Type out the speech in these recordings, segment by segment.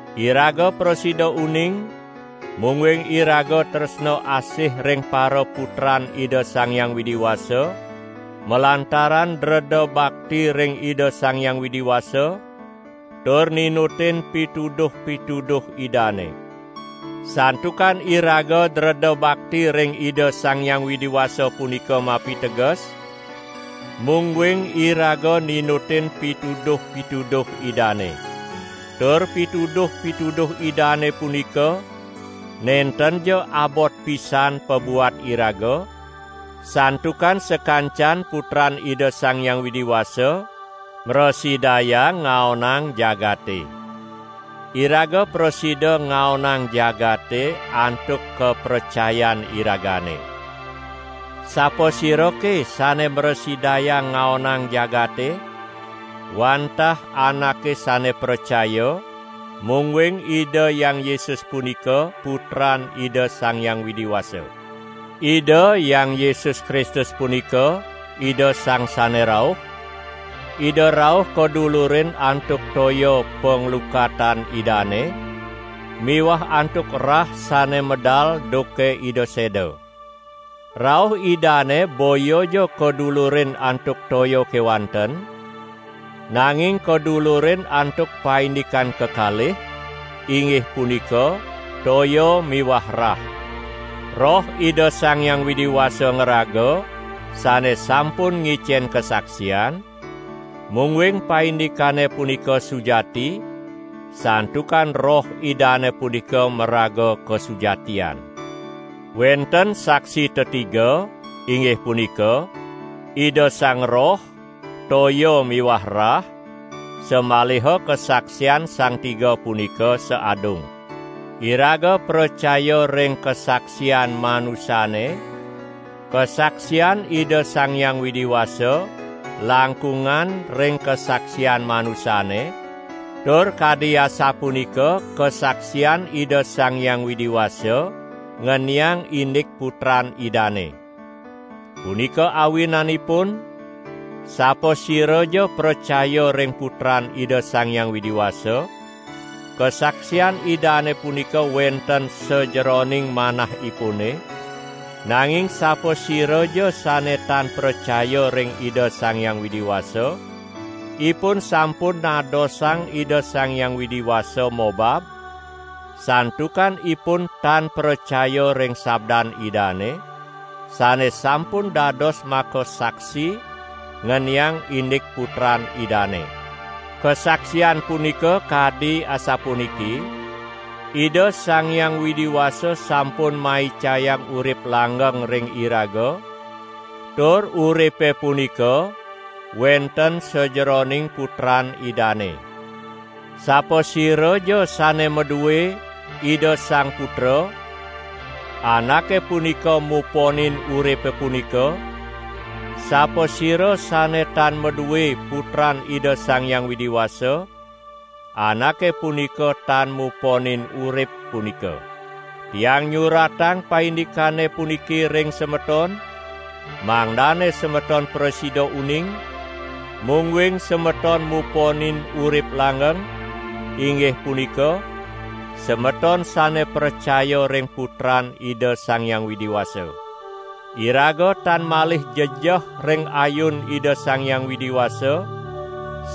Iraga prasida uning, mungguing iraga tresna asih ring paraputran Ida Sang Hyang Widi Wasa, malantaran dreda bakti ring Ida Sang Hyang Widi Wasa tur ninutin pituduh-pituduh Idane. Santukan iraga dreda bakti ring Ida Sang Hyang Widi Wasa punika mapiteges, mungguing iraga ninutin pituduh-pituduh Idane. Tur pituduh-pituduh Idane punika nentenja abot pisan pabuat iraga, santukan sakancan putran Ida Sang Hyang Widi Wasa mrasidayang ngaonang jagate. Iraga prasida ngaonang jagate antuk kapracayan iragane. Sapasirake sane mrasidayang ngaonang jagate? Wantah anake sane pracaya, mungguing Ida Hyang Yesus punika Putran Ida Sang Hyang Widi Wasa. Ida Hyang Yesus Kristus punika Ida Sang Sane Rauh; Ida rauh kadulurin antuk toya panglukatan Idane miwah antuk rah sane medal duke Ida seda. Rauh Idane boyaja kadulurin antuk toya kewanten, nanging kadulurin antuk paindikan kekalih: inggih punika toya miwah rah. Roh Ida Sang Hyang Widi ngraga sane sampun ngicen kasaksian, mungguing paindikane punika sujati, santukan Roh Idane punika maraga kasujatian. Wenten saksi tetiga, inggih punika: Ida Sang Roh, toya miwah rah, samaliha kasaksian sang tiga punika saadung. Iraga pracaya ring kasaksian manusane; kasaksian Ida Sang Hyang Widi Wasa langkungan ring kasaksian manusane, tur kadi asapunika kasaksian Ida Sang Hyang Widi Wasa ngeniang indik Putran Idane. Punika awinanipun, sapasiraja pracaya ring Putran Ida Sang Hyang Widi Wasa, kasaksian Idane punika wenten sajeroning manahipune; nanging sapasiraja sane tan pracaya ring Ida Sang Hyang Widi Wasa, ipun sampun nadosang Ida Sang Hyang Widi Wasa mobab, santukan ipun tan pracaya ring sabdan Idane, sane sampun dados makasaksi ngeniang indik Putran Idane. Kasaksian punika kadi asapuniki: Ida Sang Hyang Widi Wasa sampun maicayang urip langgeng ring iraga, tur uripe punika wenten sajeroning Putran Idane. Sapasiraja sane madue Ida Sang Putra anake punika muponin uripe punika; sapasira sane tan madue Putran Ida Sang Hyang Widi Wasa, anake punika tan muponin urip punika. Tiang nyuratang paindikane puniki ring semeton, mangdane semeton prasida uning, mungguing semeton muponin urip langgeng, inggih punika, semeton sane pracaya ring Putran Ida Sang Hyang Widi Wasa. Iraga tan malih jejeh ring ayun Ida Sang Hyang Widi Wasa,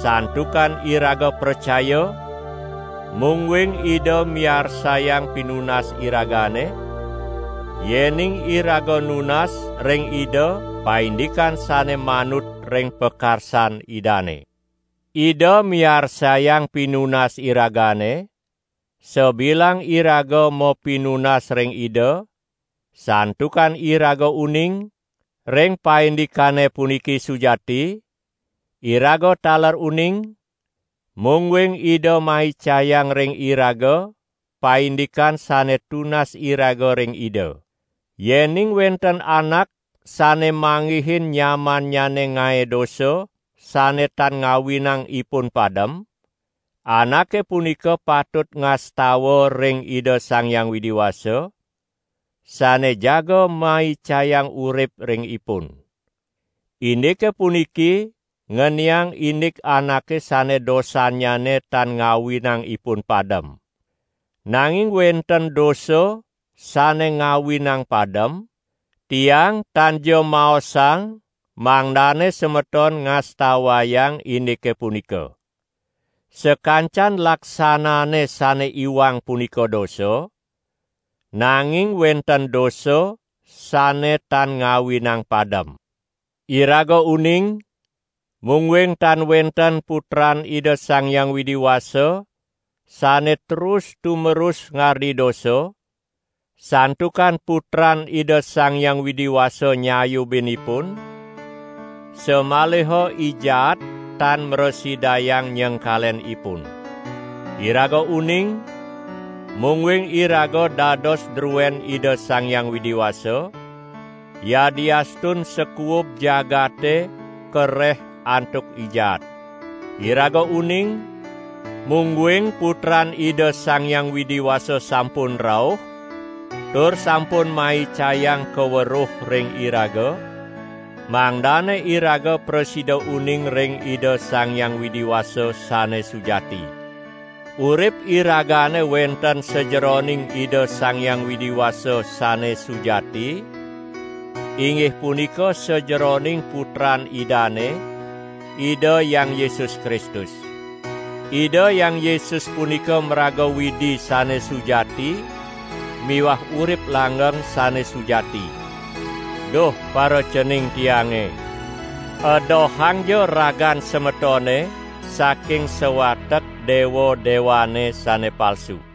santukan iraga pracaya, mungguing Ida miarsayang pinunas iragane, yening iraga nunas ring Ida paindikan sane manut ring pakarsan Idane. Ida miarsayang pinunas iragane, sabilang iraga mapinunas ring Ida; santukan iraga uning ring paindikane puniki sujati, iraga taler uning, mungguing Ida maicayang ring iraga paindikan sane tunas iraga ring Ida. Yening wenten anak sane manggihin nyamannyane ngae dosa sane tan ngawinang ipun padem, anake punika patut ngastawa ring Ida Sang Hyang Widi Wasa, sane jaga maicayang urip ring ipun. Indike puniki ngeniang indik anake sane dosannyane tan ngawinang ipun padem. Nanging wenten dosa sane ngawinang padem, tiang tanja maosang mangdane semeton ngastawayang indike punika. Sakancan laksanane sane iwang punika dosa, nanging wenten dosa sane tan ngawinang padem. Iraga uning, mungguing tan wenten putran Ida Sang Hyang Widi Wasa sane terus-tumerus ngardi dosa, santukan Putran Ida Sang Hyang Widi Wasa nyayubin ipun, samaliha I Jaat tan mrasidayang nyengkalen ipun. Iraga uning, mungguing iraga dados druen Ida Sang Hyang Widi Wasa, yadiastun sakuub jagate kareh antuk I Jaat. Iraga uning, mungguing Putran Ida Sang Hyang Widi Wasa sampun rauh tur sampun maicayang kaweruh ring iraga, mangdane iraga prasida uning ring Ida Sang Hyang Widi Wasa sane sujati. Urip iragane wenten sajeroning Ida Sang Hyang Widi Wasa sane sujati inggih punika sajeroning Putran Idane, Ida Hyang Yesus Kristus. Ida Hyang Yesus punika maraga Widi sane sujati miwah urip langgeng sane sujati. Duh paracening tiange, edohangja ragan semetone saking sawatek dewa-dewane sane palsu.